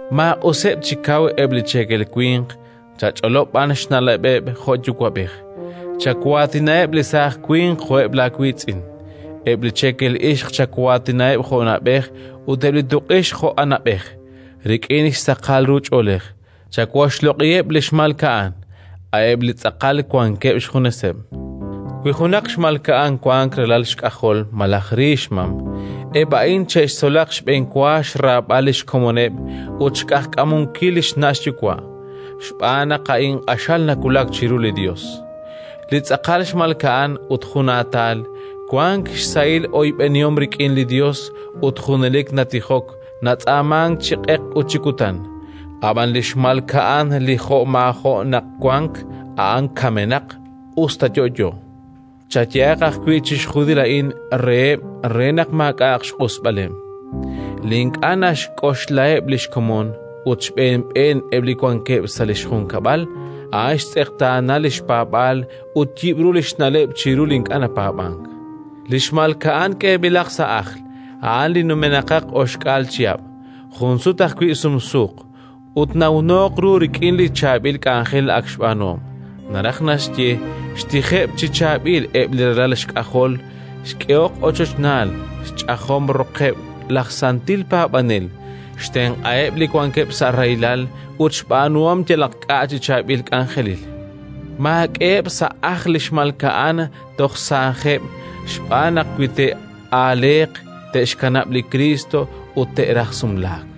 Maaq'useb' chi kaw eb' li cheekel winq, chach'olob' b'an xna'leb'eb' jo' yuwa'b'ej. Chawaatinaheb' li saaj winq jo'eb' laawiitz'in; eb' li cheekel ixq chawaatinaheb' jo' na'b'ej, ut eb' li tuq'ixq jo' anab'ej, rik'in xsaqal ru ch'oolej. Chawoxloq'iheb' li xmalka'an, a'eb' li tz'aqal wankeb' xjuneseb'. Wi junaq xmalka'an wank ralal xk'ajol malaj ri xmam, eb' a'in che'xtzolaq xb'enwa xraab'al li xkomoneb' ut xq'ajkamunkil li xna' xyuwa', xb'aan naq a'in q'axal nawulak chiru li Yos. Li tz'aqal xmalka'an ut junaatal, wank xsahil oyb'enihom rik'in li Yos ut junelik natijok natz'aamank chi q'eq ut chi kutan. Ab'an li xmalka'an li jo'maajo' naq wank, a'an kamenaq us ta yo'yo. Chayehaq ajwi' chixjunil a'in reheb', re naq maak'a'aq xq'usb'aleb'. Li ink'a' naxk'oxlaheb' li xkomon, ut xb'een xb'een eb' li wankeb' sa' li xjunkab'al, a'an xtz'eqtaana li xpaab'aal ut yib'ru li xna'leb' chiru li ink'a' napaab'ank. Li xmalka'an k'eeb'ilaq sa' ajl, a'an li numenaqaq oxk'aal chihab', jun sut ajwi' sumsuuq, ut nawnooq ru rik'in li chaab'il k'anjel ak xb'aanuhom: naraj naxye, xtijeb' chi chaab'il eb' li ralal xk'ajol, xk'ehok ochochnaal, xch'ajom roqeb' laj santil paab'anel, xtenq'aheb' li wankeb' sa' rahilal ut xb'aanuhom yalaq k'a' chi chaab'il k'anjelil. Maak'eheb' sa' ajl li xmalka'an toj saajeb' xb'aan naq, wi te'aaleeq, te'xkanab' li Kriist ut te'raj sumlaak;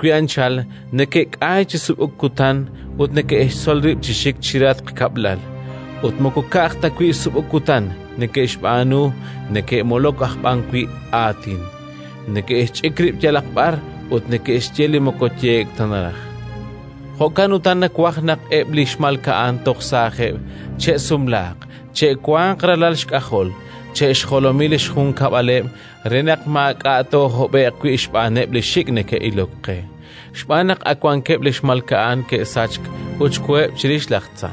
Jo'wi' anchal, neke'k'ayk chi sub'uk kutan ut neke'xtzol rib' chi xik chirehatq kab'lal; ut moko ka'aj ta wi' sub'uk kutan neke'xb'aanu, neke'molok aj b'an wi' aatin, neke'xch'ik rib' yalaq b'ar ut neke'xye li moko yehe'k ta naraj. Jo'kan utan nawaj naq eb' li xmalka'an toj saajeb' che'sumlaaq, che'wanq ralal xk'ajol, che'xjolomi li xjunkab'aleb' re naq maak'a' toohob'e'q wi' xb'aaneb' li xik' neke'ilok qe. Xb'aan naq ak wankeb' li xmalka'an xe'sachk ut xkoheb' chirix laj tza.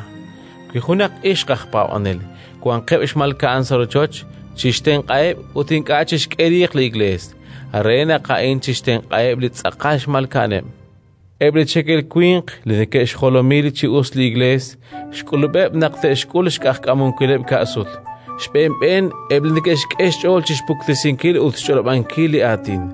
Wi junaq ixq aj paab'anel wanqeb' xmalka'an sa' rochoch, chixtenq'aheb' ut ink'a' chixk'e riiq li Iklees, re naq A'in chixtenq'aheb' li tz'aqal xmalka'aneb'. Eb' li cheekel winq li neke'xjolomi chi us li Iklees, xk'ulub'eb' naq te'xk'ul xq'ajkamunkileb' ka' sut, xb'een xb'een eb' li neke'xk'e xch'ool chi xpuktesinkil ut xch'olob'ankil li Aatin,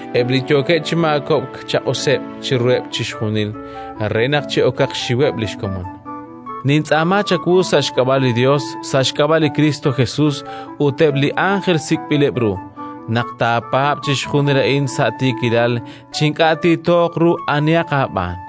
Eb' li yookeb' chi maakob'k, chaq'useb' chiruheb' chixjunil re naq chi'okaq xxiweb' li xkomon. Nintz'aama chawu sa' xk'ab'a' li Yos, sa' xk'ab'a' li Kristo Jesus ut eb' li ánjel sik'b'ileb' ru, naq taapaab' chixjunil a'in sa' tiikilal, chi ink'a' tiitooq ru anihaq aab'aan.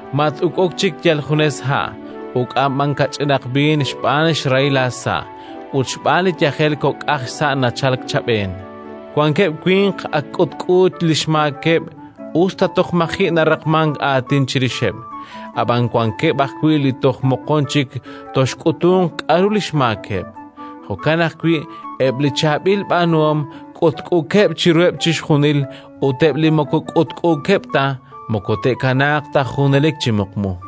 Mat-uk'uk chik yal junes ha', uk'an b'an kach'inaq b'iin xb'aan xrahil aasa' ut xb'aan li yajel kok'aq xsa' nachalk chab'een. Wankeb' winq ak k'utk'u li xmaakeb', us ta toj maji' naraqmank aatin chirixeb'; ab'an wankeb' ajwi' li toj moqon chik toxk'utunq k'aru li xmaakeb'. Jo'kan ajwi' eb' li chaab'il b'aanuhom k'utk'uukeb' chiruheb' chixjunil; ut eb' li moko k'utk'uukeb' ta, moko te'kanaaq ta junelik chi muqmu.